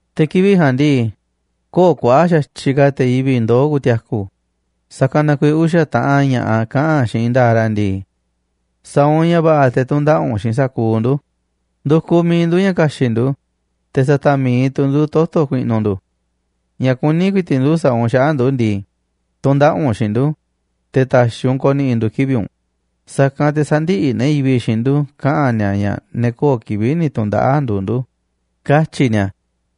Te̱ kivi̱ꞌ ja̱a̱nꞌ ndii, köo̱ꞌ kuaꞌa̱ꞌ xa̱tyiꞌ ka̱ te̱ yivi̱ꞌ ndoo̱ ku̱ti̱a̱ku̱, sa̱kanꞌ na kuiiꞌ uxa̱ taꞌan ña̱ꞌaꞌ kaꞌa̱n xiinꞌ i̱i̱n nda̱a̱ꞌ ra̱ ndii: “Sa̱a̱ u̱nꞌ ña̱ va̱ꞌa̱ te̱ tu̱ndaꞌa̱ꞌ u̱nꞌ xiinꞌ sa̱kuuꞌ ndu̱ꞌ. Ndu̱kuꞌ miiꞌ ndu̱ ña̱ ka̱xi̱ꞌ ndu̱, te̱ sa̱ta̱ꞌ mi̱iꞌ tu̱ ndu̱ toto̱ ku̱i̱ꞌnu̱ ndu̱. Ña̱ kuní ku̱i̱ti̱ꞌ ndu̱ sa̱a̱ u̱nꞌ xaꞌa̱ꞌ ndu̱ ndii, tu̱ndaꞌa̱ꞌ u̱nꞌ xiinꞌ ndu̱, te̱ ta̱xi̱ u̱nꞌ ko̱ni̱ꞌi̱ ndu̱ kivi̱ꞌ u̱nꞌ, sa̱kanꞌ te̱ sä̱ndi̱ꞌi̱ ne̱ yivi̱ꞌ xiinꞌ ndu̱ꞌ kaꞌa̱n ni̱a̱ ña̱ ne̱ köo̱ꞌ kivi̱ꞌ ni̱ tu̱ndaꞌa̱ꞌ nduuꞌ ndu̱”, katyi̱ ni̱a̱.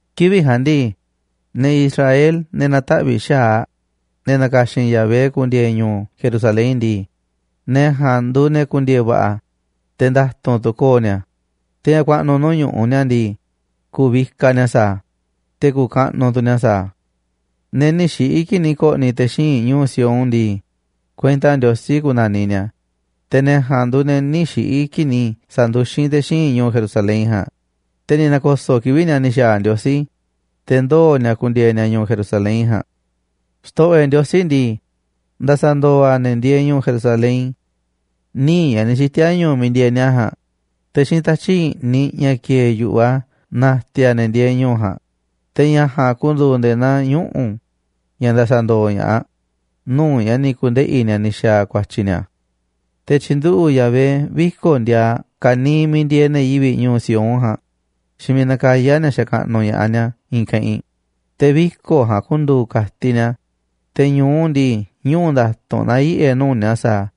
Kivi̱ꞌ ja̱a̱nꞌ ndii, ne̱ Israel, ne̱ na̱taꞌvi̱ꞌ xa̱aꞌ, ne̱ na̱ka̱xi̱n Yahvé ku̱ndi̱e̱e̱ ñu̱u̱ Jerusalén ndii, ne̱ ja̱a̱nꞌ nduuꞌ ne̱ ku̱ndi̱e̱e̱ va̱ꞌa̱, te̱ nda̱tu̱nꞌ tu̱ ko̱o̱ ni̱a̱, te̱ ña̱ ku̱a̱ꞌnu̱ nuu̱ꞌ ñu̱ꞌuꞌ ni̱a̱ ndii, ku̱vikaꞌ ni̱a̱ sa̱a̱ a̱, te̱ ku̱kaꞌnuꞌ tu̱ ni̱a̱ sa̱a̱ a̱. Ne̱ nï̱ xiꞌi̱ kii̱ꞌ ni̱ ko̱ꞌni̱ te̱ xíinꞌ ñu̱u̱ Sión ndii, kuenta Ndiosí ku̱na̱niꞌ ni̱a̱, te̱ ne̱ ja̱a̱nꞌ nduuꞌ ne̱ nï̱ xiꞌi̱ kii̱ꞌ ni̱ sa̱nduxín te̱ xíinꞌ ñu̱u̱ Jerusalén ja̱a̱nꞌ, te̱ ni̱ na̱ko̱so̱ꞌ kivi̱ꞌ ni̱a̱ ni̱ xa̱a̱ Ndiosí, te̱ ndoo̱ ni̱a̱ ku̱ndi̱e̱e̱ ni̱a̱ ñu̱u̱ Jerusalén ja̱a̱nꞌ. Xto̱ꞌo̱ e̱ꞌ Ndiosí ndii, nda̱sa̱ndo̱o̱ a̱ ne̱ ndieeꞌ ñu̱u̱ Jerusalén níiꞌ ña̱ ni̱ xiti̱a̱ ñu̱u̱ miiꞌ ndieeꞌ ni̱a̱ ja̱a̱nꞌ, te̱ xiinꞌ tatyi̱ꞌ i̱ꞌniꞌ ña̱ kieeꞌ yu̱ꞌuꞌ a̱ na̱ti̱a̱ a̱ ne̱ ndieeꞌ ñu̱u̱ ja̱a̱nꞌ, te̱ ña̱ ja̱a̱nꞌ ku̱ndu̱u̱ nde̱e̱ naa ñuꞌu̱ ña̱ nda̱sa̱ndo̱o̱ ña̱ꞌaꞌ nuu̱ꞌ ña̱ ni̱ ku̱ndeꞌi̱ ni̱a̱ ni̱ xa̱a̱ ku̱a̱tyi̱ ni̱a̱. Te̱ tyi̱nduꞌu̱ꞌ Yahvé viko̱ꞌ ndiaaꞌ ka̱niiꞌ miiꞌ ndieeꞌ ne̱ yivi̱ꞌ ñu̱u̱ Sión ja̱a̱nꞌ xiinꞌ miiꞌ nakayá ni̱a̱ xakaꞌnuꞌ ña̱ꞌaꞌ ni̱a̱ i̱i̱n keꞌinꞌ. Te̱ viko̱ꞌ ja̱a̱nꞌ ku̱ndu̱u̱ ka̱tiꞌ ni̱a̱, te̱ ñu̱u ndii, ñuꞌu̱ nda̱tu̱nꞌ na̱yiꞌe̱ nuu̱ꞌ ni̱a̱ sa̱a̱ a̱.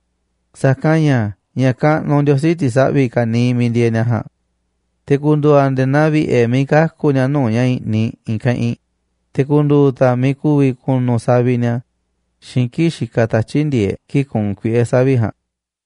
Sa̱kanꞌ ña̱ ña̱ kaꞌnuꞌ Ndiosí ti̱saꞌvi̱ ka̱niiꞌ miiꞌ ndieeꞌ ni̱a̱ ja̱a̱nꞌ. Te̱ ku̱ndu̱u̱ a̱ nde̱e̱ naa vi̱ꞌe̱ miiꞌ kaku̱ ni̱a̱ nuu̱ꞌ ña̱ i̱ꞌniꞌ i̱i̱n keꞌinꞌ, te̱ ku̱ndu̱u̱ tu̱ a̱ miiꞌ ku̱vi̱ ku̱nu̱ saviꞌ ni̱a̱ xiinꞌ kii̱ꞌ xikaꞌ tatyi̱ꞌ ndi̱e̱eꞌ kii̱ꞌ kuunꞌ kuiꞌe̱ savi̱ꞌ ja̱a̱nꞌ.